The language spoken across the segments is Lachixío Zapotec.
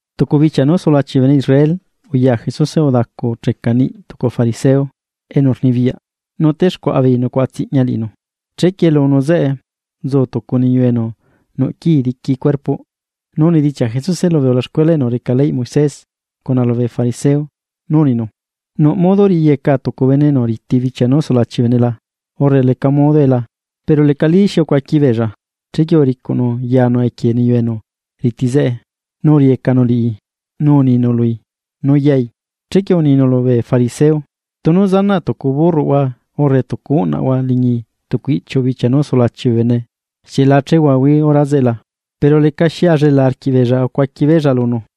Tucu bichia nú sulachi bee bene Israel, uya Jesuse udacucheca niꞌi tucu fariseo enu rnibiyaꞌ, nu texcuaꞌa beei nucuaꞌa tsiꞌña liꞌinu. Chequie lunu zeꞌe, nzu tucu niyu enu nuꞌ quii diqui beꞌlaꞌ. Nu unidichiaꞌ Jesuse lubee ulaxcuela enu reca ley Moisés cuna lubee fariseo nu uninu: ―¿Nuꞌ modo riꞌiyeca tucu bene enu riti bichia nú sulachi bee bene la? urre ¿leca modue la? Pero lecalí xi ucuaqui beella, chequie uricuꞌnu yanu equie niyu enu riti zeꞌe, nu uriꞌiyecanu liꞌi nu uninu lui nu yai. Chequie uninu lubee fariseo: ―Tunu zanaꞌ tucu burroꞌhua urre tucu uꞌnaꞌhua liñi tucu iꞌchiu bichia nú sulachi bee bene, ¿xieꞌ la chehuahuaí hora zeꞌe la? Pero lecaxi ullela arquiꞌbeella acuaqui beella lunu.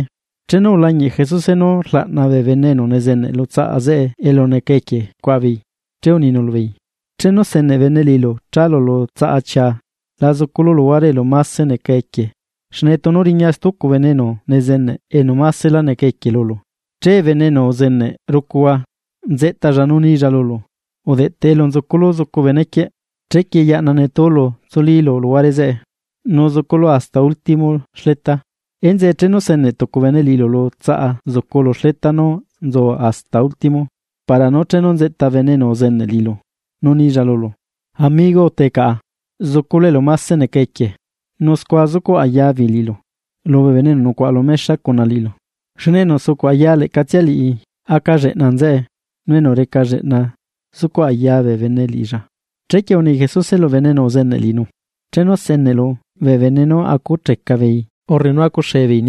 Chenu ulañiꞌ Jesuse nú rlaꞌna bee bene enu nezeneꞌ lu tsaꞌa zeꞌe elu neca equie cuaꞌa beei. Che uninu lubeei: ―Chenu seneꞌ bene liꞌilu chalu lu tsaꞌa chia, la zuculu luhuare elu mase neca equie, xne tunu riña stucu bene enu nezeneꞌ enu masela neca equie lulu, che bene enu uzeneꞌ rucuhua, nzeꞌtalla nu nilla lulu: “Udeꞌteꞌ elu nzuculu zucu benequieꞌ.” Chequie yaꞌna netúlu tsulílu luhuare zeꞌe, nu zuculu hasta último xleta. Enzeꞌe chenu seneꞌ tucu bene liꞌilu lu tsaꞌa zucu lu xleta nú nzu hasta último, para nú chenu nzeꞌta bene enu uzeneꞌ liꞌilu nu nilla lulu: “Amigo, utee caꞌa zuculu elu máse neca equie.” Nu scua zucuꞌ aya beei liꞌilu lubee bene enu nucuaꞌa lu mexa cuna liꞌilu. Xne enu sucuꞌ aya leꞌcatsia liꞌi, aca lleꞌna nzeꞌe, nu enu reca lleꞌna zucuꞌ aya bee bene liꞌilla. Chequie uni Jesuse lu bene enu uzeneꞌ liꞌinu: ―Chenu seneꞌlu bee bene nú acucheca beei urre nú acuxee beei,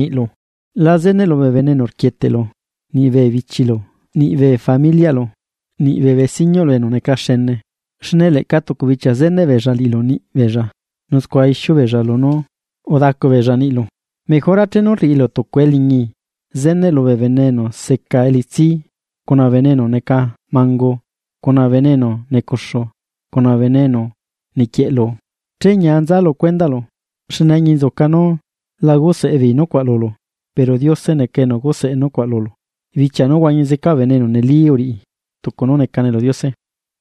la zeneꞌlu bee bene enu rquieteꞌlu, niꞌ bee bichilu, niꞌ bee familiꞌlu, niꞌ bee besiñuꞌlu enu neca xene. Xne leꞌca tucu bichia zeneꞌ beella liꞌilu niꞌ beella, nu scua ixiu beella lunú udacu beella niꞌlu. Mejora chenu rriꞌilu tucu eliñi, zeneꞌlu bee bene enu seca elitsi, cuna bee bene enu neca mangu, cuna bee bene enu necuxu, cuna bee bene enu niquieꞌlu. Che ñia nza lu cuendaꞌlu, xne añinzuca nu la guseaꞌ beei nucuaꞌ lulu. Pero Diose neca enu guseꞌe nucuaꞌ lulu bichia nú huañi zeca bee bene enu neli uriꞌi tucu nú necane lu Diose.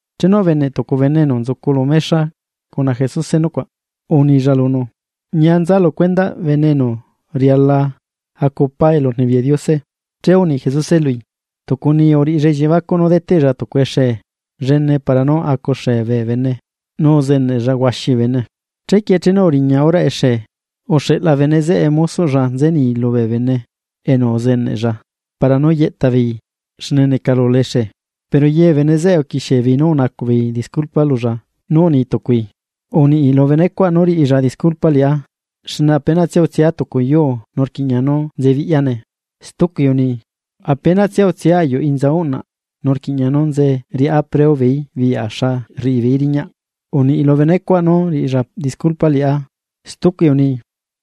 Chenu ubeneꞌ tucu bene enu nzucu lu mexa cuna Jesuse nucuaꞌ, unilla lunu: ―Ñia nza lu cuendaꞌ bene enu riala acu pá elurnibiyaꞌ Diose. Che uni Jesuse lui: ―Tucu niyu uriꞌilla elliebacuꞌ nú deteꞌlla tucu exee llene para nú acu xee bee bene, nu uzeneꞌlla huaxi bee bene. Chequie chenu uriña horaꞌ exee, uxeꞌla bene zeꞌe mosoꞌlla nze ni lubee bene enu uzeneꞌlla para nú yeꞌta beei xne necalula exee. Pero ye bee bene zeꞌe uquixie beei nú unacuꞌ beei disculpa lulla nu uni tucui: “Uniꞌi lu benecuaꞌ nú riꞌilla disculpa liꞌá, xne apenatsia utsia tucu yuu nu rquiꞌña nú nzebiꞌyane.” Stucui uni: “Apenatsia utsia ayuꞌ inza uꞌnaꞌ, nu rquiꞌña nú nze riꞌá preo beeí biꞌya xa rriꞌi beei riñaꞌ. Uniꞌ lu benecuaꞌ nú riꞌilla disculpa liꞌá.” Stucui uni: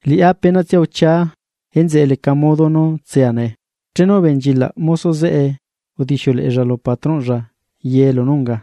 “Liꞌá apenatsia uchiaa. Enzeꞌe leca modo nú tsea nee.” Chenu ubenchilaꞌ mosoꞌ zeꞌe udixiuleꞌella lu patrónꞌlla ye lunú unga.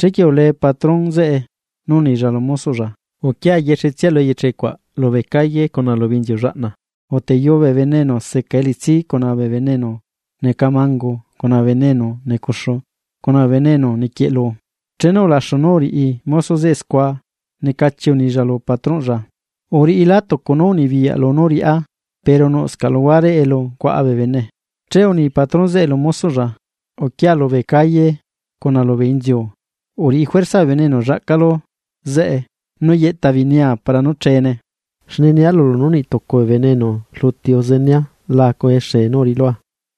Chequie ulee patrón zeꞌe, nú unilla lu mosoꞌlla: “Uquia yexetsia lu eyeche cuaꞌ lubee inziu llene cuna lubee inziu llaꞌna, uteyuu bee bene enu seca elitsi, cuna bee bene enu neca mangu, cuna bee bene enu necuxu, cuna bee bene enu niquieꞌlu.” Chenu ulaxu nú uriꞌi mosoꞌ zeꞌe scua, necachi unilla lu patrónꞌlla: “Uriꞌilá tucu nú unibiyaꞌlu nú riꞌá, pero nuꞌscaꞌ luhuare elu cuaꞌa bee bene.” Che uni patrón zeꞌe lu mosoꞌlla: “Uquia lubee calle cuna lubee inziu. Uriꞌi Juerza bee bene enu llaꞌcalu zeꞌe, nú yeꞌta beei nia para nú cheene. Xne nia lulu nú niꞌ tucu bee bene enu rluti uzenea la acu exee nú uriꞌilua.”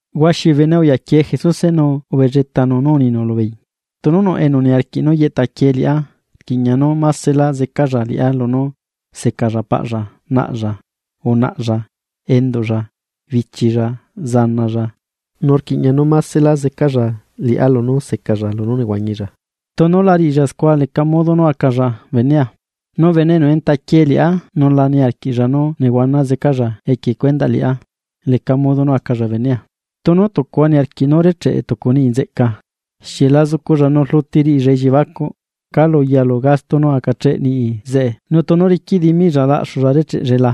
Huaxi bee bene uyaquie Jesuse, nu ubelletanu nú uninu lubeei: ―Tunu nuꞌ enu niarquiꞌ nú yeꞌta quie liꞌá, rquiꞌña nú másela zecalla liꞌá lunú secalla paꞌlla, naꞌlla, unaꞌalla, enduꞌlla, bichilla, zanalla, nu rquiꞌña nú másela zecalla liꞌá lunú secalla lunú nehuañilla. Tunu la riꞌilla scua leca modo nú acalla benea. Nu bene enu entaquie liꞌá nu la niarquiꞌlla nú nehuana zecalla equie cuendaꞌ liꞌá, leca modo nú acalla benea. Tunu tucuhua niarquiꞌ nú recheꞌe tucu niꞌi nzeꞌca, ¿xieꞌ la zuculla nu rluti riꞌilla elliebacuꞌ calu yalu gasto nú acacheꞌ niꞌi zeꞌe nu tunu riquiꞌ dimiꞌlla laꞌxulla recheꞌellae la?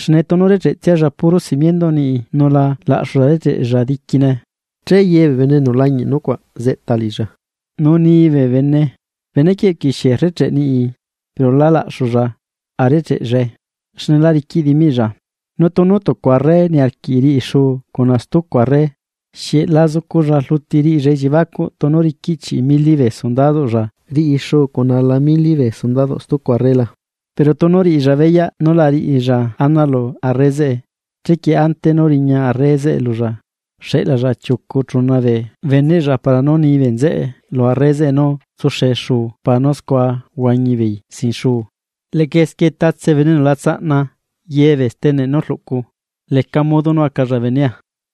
Xne tunu recheꞌtsialla puro simienduꞌ niꞌi nu la laꞌxulla recheꞌella diquine, che ye bee bene enu lañiꞌ nucuaꞌ tsequichiaꞌ liꞌilla, nu ni bee bene: “Benequieꞌ uquixie rrecheꞌ niꞌi pero lá laꞌxulla a recheꞌellae xne la riquiꞌ dimiꞌlla.” Nu tunu tucu arre niarquiꞌ riꞌi xuu cuna stucu arre, ¿xieꞌ la zuculla rluti riꞌilla elliebacuꞌ tunu riquiꞌ chiꞌi mili bee sundadoꞌlla riꞌi xuu cuna ala mili bee sundadoꞌ stucu arre la? Pero tunu riꞌilla beyaꞌ nú la riꞌilla ana lu arre zeꞌe, chequie ante nú riña arre zeꞌe lulla, xeꞌlalla chiucu chuna bee beneꞌlla para nú ni bee nzeꞌe lu arre zeꞌe nú tsuxee xuu para nú scua huañi beei sin xuu. Leꞌca esquie tatse bene enu la tsaꞌna ye bee steneꞌlla nú rluꞌculla, leca modo nú acalla benea.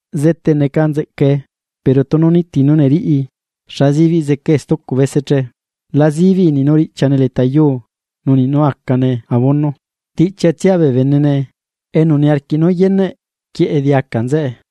’Zete neca nzeꞌcae. Pero tunu niti nú neriꞌi, ¿xa sibiꞌ zecae stucu bese che? La zibiꞌi niꞌ nú riꞌchiane leta yuu nu niꞌ nú acane abono, tiꞌchiatsia bee benene. Enu niarquiꞌ nú yeneꞌ, quieꞌe diaca nzeꞌe.